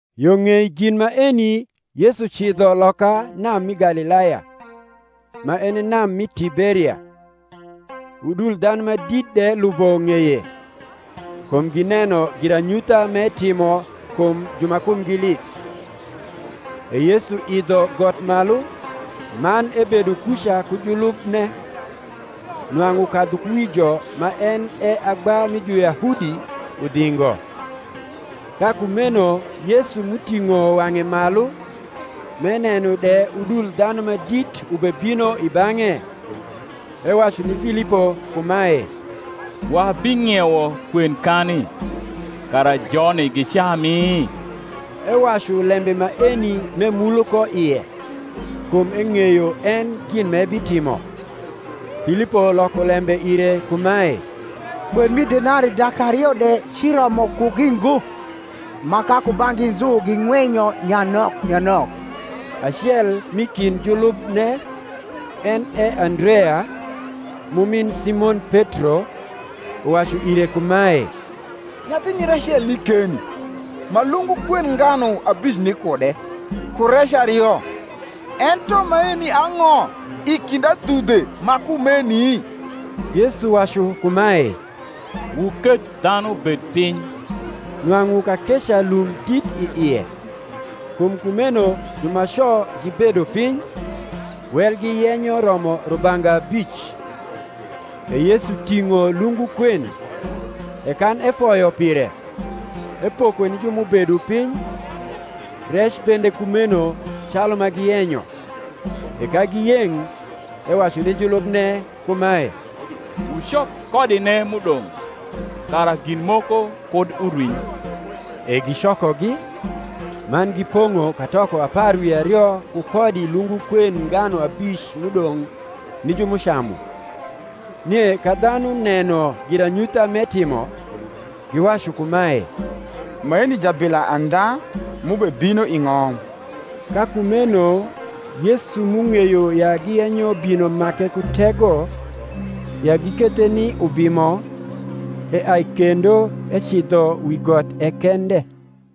Yo ng’ei gin maeni Yesu cidho loka nam mi Galilaya, ma en e nam mi Tiberia. Udul dhanu ma dit de lubo ng’eye, kum gineno giranyutha m’etimo kum ju ma kumgi lith. E Yesu idho got malu, man ebedo kuca ku julubne. Nwang’u kadhukuwijo ma en e agba mi Juyahudi, udhingo. Ka kumeno Yesu m’uting’o wang’e malu, m’eneno de udul dhanu ma dit ubebino i bang’e, ewacu ni Filipo kumae, Wabing’iewo kwen kani, kara joni gicami? Ewacu lembe maeni m’emulo ko ie: kum eng’eyo en gin m’ebitimo. Filipo loko lembe ire kumae, Kwen mi denarii dak ario de ciromo kugi ngo, ma ka kubang’gi nzu ging’wenyo nyanok nyanok. Acel m’i kind julubne, en e Andrea, m’umin Simon Petro, uwacu ire kumae, Nyathinyir acel ni keni, ma lungu kwend nganu abic ni kude, ku rec ario: ento maeni ang’o i kind adhudhe ma kumeni? Yesu wacu kumae, Wuketh dhanu bed piny. Nwang’u kakeca lum dit i ie. Kum kumeno jumaco gibedo piny, welgi yenyo romo rubanga abic. E Yesu ting’o lungu kwen; e kan efoyo pire, epoko ni ju m’ubedo piny; rec bende kumeno calu ma giyenyo. E ka giyeng’, ewacu ni julubne kumae, Wucok kodine m’udong’, kara gin moko kud urwiny. E gicokogi, man gipong’o katoko apar wi ario ku kodi lungu kwend nganu abic m’udong’ ni ju m’ucamu. Nie ka dhanu neno giranyutha m’etimo, giwacu kumae, Maeni jabila andha m’ubebino i ng’om. Ka kumeno Yesu m’ung’eyo ya giyenyo bino make ku tego, ya gikethe ni ubimo, eai kendo ecidho wi got e kende.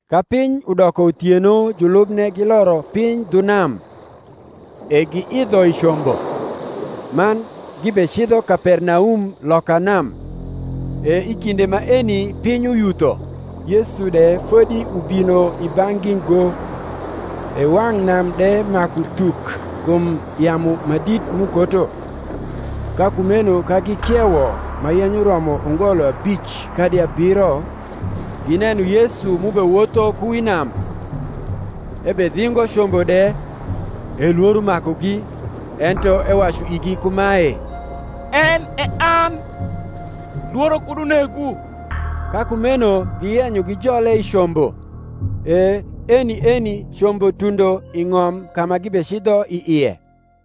Ka piny udoko uthieno julubne giloro piny dhu nam; e giidho i combo, man gibecidho Kapernaum loka nam. E i kinde maeni piny uyutho, Yesu de fodi ubino i bang’gi ngo. E wang’ nam de maku tuk kum yamu ma dit m’ukoto. Ka kumeno ka gikiewo ma yenyo romo ungolo abic kadi abiro, gineno Yesu m’ubewotho ku wi nam, ebedhingo combo de: e lworo makugi. Ento ewacu igi kumae, En e an; lworo kud unegwu. Ka kumeno giyenyo gijole i combo: e eni eni combo tundo i ng’om ka ma gibecidho i ie.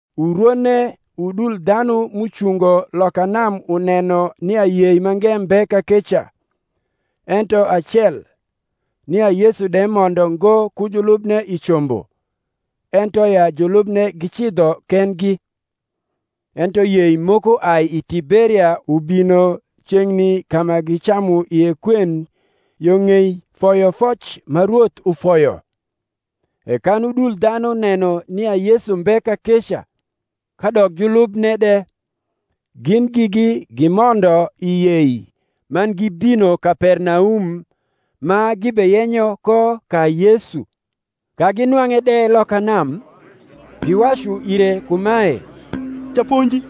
Urwone udul dhanu m’ucungo loka nam uneno nia yei mange mbe kakeca, ento acel, nia Yesu de mondo ngo ku julubne i combo, ento ya julubne gicidho kendgi (ento yei moko ai i Tiberia ubino ceng’ni ka ma gicamu ie kwen yo ng’ei foyofoc ma Rwoth ufoyo): e kan udul dhanu neno nia Yesu mbe kakeca, kadok julubne de, gin gigi gimondo i yei, man gibino Kapernaum, ma gibeyenyo ko ka Yesu. Ka ginwang’e de loka nam, giwacu ire kumae, Japonji,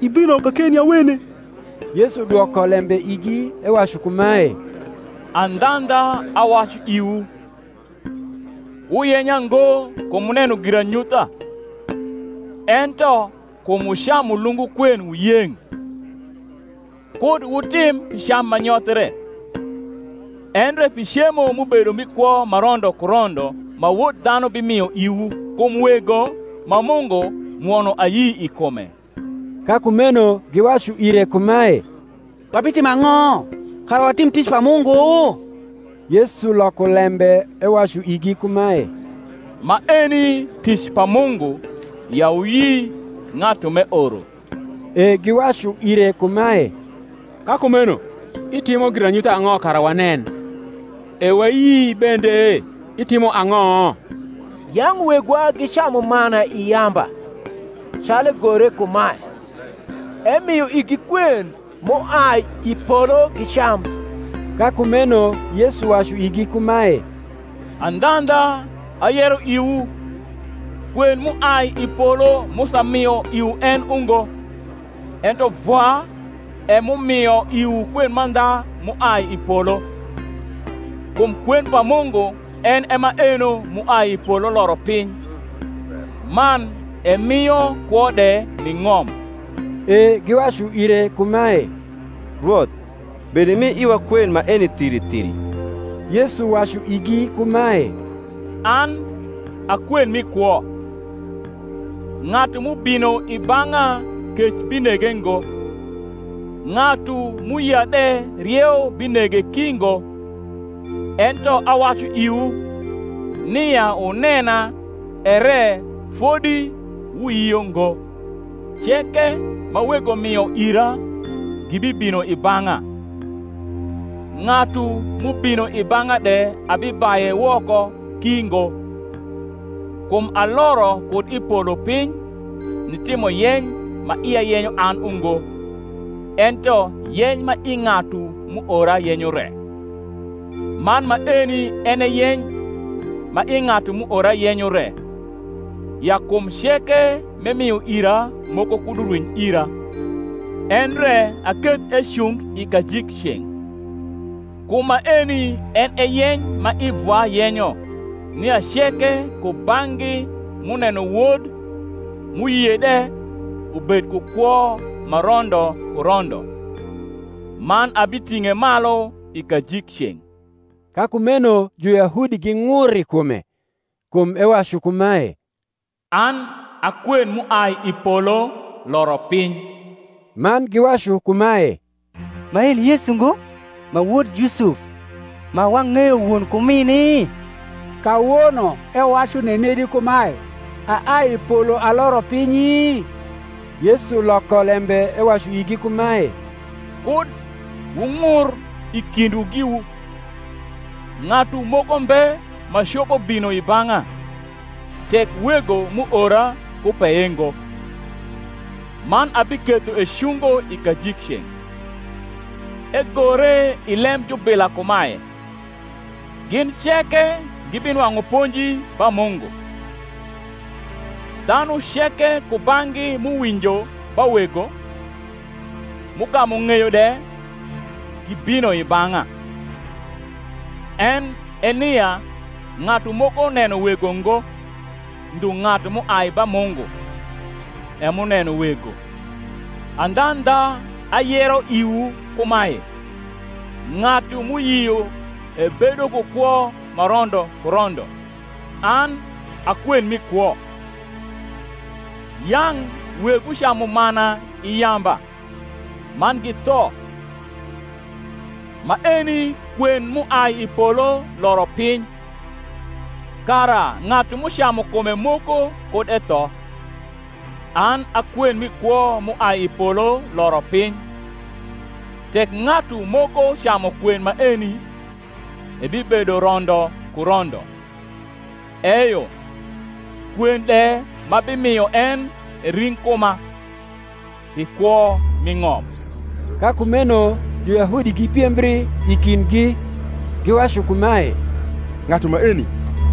ibino kakeni awene? Yesu dwoko lembe igi ewacu kumae, Andhandha, awacu iwu, Wuyenya ngo kum wuneno giranyutha, ento kum wucamu lungu kwen wuyeng’. Kud wutim pi cam ma nyothre, endre pi cemo m’ubedo mi kwo ma rondo ku rondo ma Wod dhanu bimio iwu: kum Wego, ma Mungu, mwono ayi i kume. Ka kumeno giwacu ire kumae, Wabitimo ang’o, kara watim tic pa Mungu? Yesu loko lembe ewacu igi kumae, Maeni tic pa Mungu ya wuyi ng’atu m’eoro. E giwacu ire kumae, Ka kumeno itimo giranyutha ang’o kara wanen, e wayii bende? itimo ang’o? Yang’ wegwa gicamu mana i yamba; calu egore kumae, Emio igi kwen m’uai i polo gicam. Ka kumeno Yesu wacu igi kumae, Andhandha, ayero iwu, Kwen m’uai i polo Musa mio iwu en ungo; ento Vwa e m’umio iwu kwen mandha m’uai i polo. Kum kwen pa Mungu en e maeno m’uai i polo loro piny, man emio kwo de ni ng’om. E giwacu ire kumae, Rwoth, bedimi iwa kwen maeni thiri thiri. Yesu wacu igi kumae, An a kwen mi kwo: ng’atu m’ubino i bang’a kec binege ngo, ng’atu m’uyia de rieu binege ki ngo. Ento awacu iwu, nia wunena, ere fodi wuyio ngo. Ceke ma Wego mio ira gibibino i bang’a: ng’atu m’ubino i bang’a de abibaye woko ki ngo. Kum aloro kud i polo piny, nitimo yeny ma ia yenyo an ungo, ento yeny ma i ng’atu m’uora yenyo re. Man maeni en e yeny ma i ng’atu m’uora yenyo re, ya kum ceke m’emio ira moko kud urwiny ira, endre aketh ecung i kajikceng’. Kum maeni en e yeny ma i Vwa yenyo nia ceke kubang’gi m’uneno Wod, m’uyie de, ubed ku kwo ma rondo ku rondo; man abiting’e malu i kajikceng’. Ka kumeno Juyahudi ging’ur i kume, kum ewacu kumae, An a kwen m’uai i polo loro piny. Man giwacu kumae, Maeni Yesu ngo, ma wod Yusuf, ma wang’eyo won ku mini? kawono ewacu nenedi kumae, Aai i polo aloro pinyi? Yesu loko lembe ewacu igi kumae, Kud wung’ur i kindwu giwu. Ng’atu moko mbe ma copo bino i bang’a, tek Wego m’uora kupeye ngo: man abiketho ecungo i kajikceng’. Egore i lem jubila kumae, Gin ceke gibinwang’u ponji ba Mungu. Dhanu ceke kubang’gi m’uwinjo ba Wego, m’ugamu ng’eyo de gibino i bang’a. En e nia ng’atu moko neno Wego ngo, ndhu ng’atu m’uai ba Mungu, e m’uneno Wego. Andhandha, ayero iwu kumae, Ng’atu m’uyio ebedo ku kwo ma rondo ku rondo. An a kwen mi kwo. Yang’ wegwu camu mana i yamba, man githo. Maeni kwen m’uai i polo loro piuy, kara ng’atu m’ucamu kume moko kud etho. An a kwen mi kwo m’uai i polo loro piny: tek ng’atu moko camu kwen maeni, ebibedo rondo ku rondo: eyo kwen de m’abimio en e ring’ kuma, pi kwo mi ng’om. Ka kumeno Juyahudi gipiembri i kindgi, giwacu kumae, Ng’atu maeni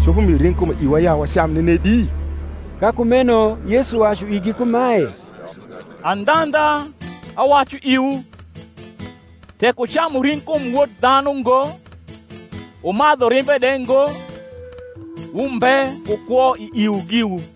copo mio ring’ kume iwa ya wacam nenedi? Ka kumeno Yesu wacu igi kumae, Andhandha, awacu iwu, Tek wucamu ring’ kum Wod dhanu ngo, wumadhu rimbe de ngo, wumbe ku kwo i iwu giwu.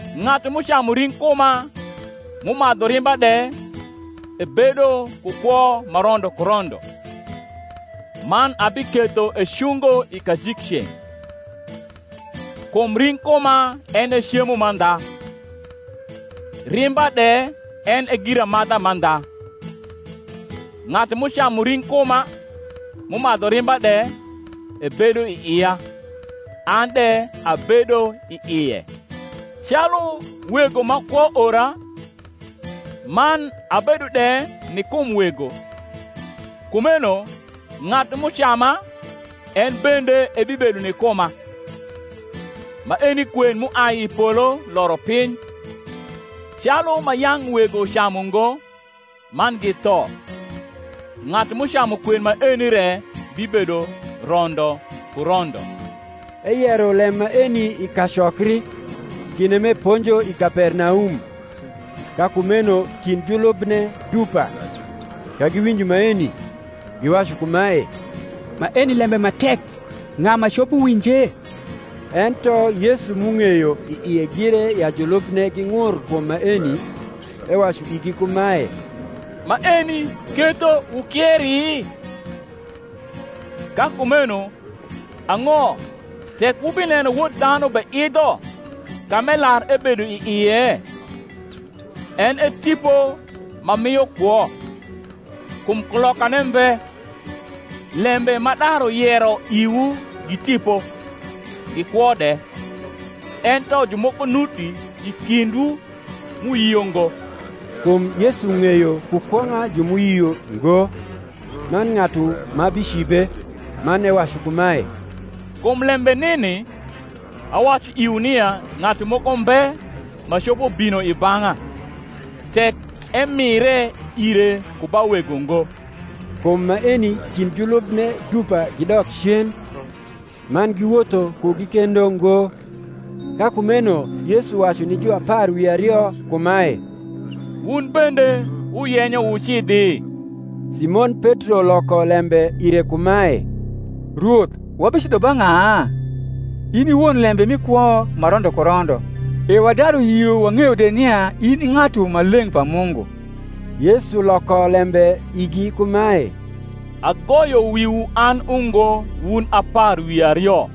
Ng’atu m’ucamu ring’ kuma m’umadhu rimba de ebedo ku kwo ma rondo ku rondo; man abiketho ecungo i kajikceng’. Kum ring’ kuma en e cemo mandha, rimba de en e giramadha mandha. Ng’atu m’ucamu ring’ kuma m’umadhu rimba de ebedo i ia, an de abedo i ie. Calu Wego ma kwo ora, man abedo de ni kum Wego; kumeno ng’atu m’ucama en bende ebibedo ni kuma. Maeni kwen m’uai i polo loro piny: calu ma yang’ wego camu ngo, man githo; ng’atu m’ucamu kwen maeni re bibedo rondo ku rondo. Eyero lem maeni i kacokri, kinde m’eponjo i Kapernaum. Ka kumeno kind julubne dupa, ka giwinjo maeni, giwacu kumae, Maeni lembe ma tek ng’a ma copo winje? Ento Yesu m’ung’eyo i ie gire ya julubne ging’ur kum maeni, ewacu igi kumae, Maeni ketho wukieri? Ka kumeno ang’o tek wubineno Wod dhanu beidho ka m’elar ebedo i ie? En e tipo ma mio kwo; kum kulokane mbe: lembe m’adaru yero iwu gi tipo, gi kwo de. Ento jumoko nuti i kindwu m’uyio ngo. Kum Yesu ng’eyo ku kwong’a ju m’uyio ngo, man ng’atu ma bicibe. Man ewacu kumae, Kum lembe nini awacu iwu nia ng’atu moko mbe ma copo bino i bang’a, tek emire ire ku ba Wego ngo. Kum maeni kind julubne dupa gidok cen, man giwotho kugi kendo ngo. Ka kumeno Yesu wacu ni ju apar wi ario kumae, Wun bendewuyenyo wucidhi? Simon Petro loko lembe ire kumae, Rwoth, wabicidho ba ng’a? In i won lembe mi kwo ma rondo ku rondo. E wadaru yio wang’eyo de nia in i Ng’atu Maleng’ pa Mungu. Yesu loko lembe igi kumae, Agoyo wiwu an ungo wun apar wi ario,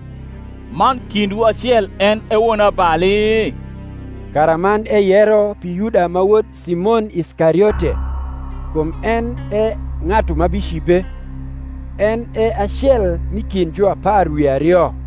man kindwu acel en e wonabali? Karaman eyero pi Yuda ma wod Simon Iskariote, kum en e ng’atu ma bicibe, en e acel m’i kind juapar wi ario.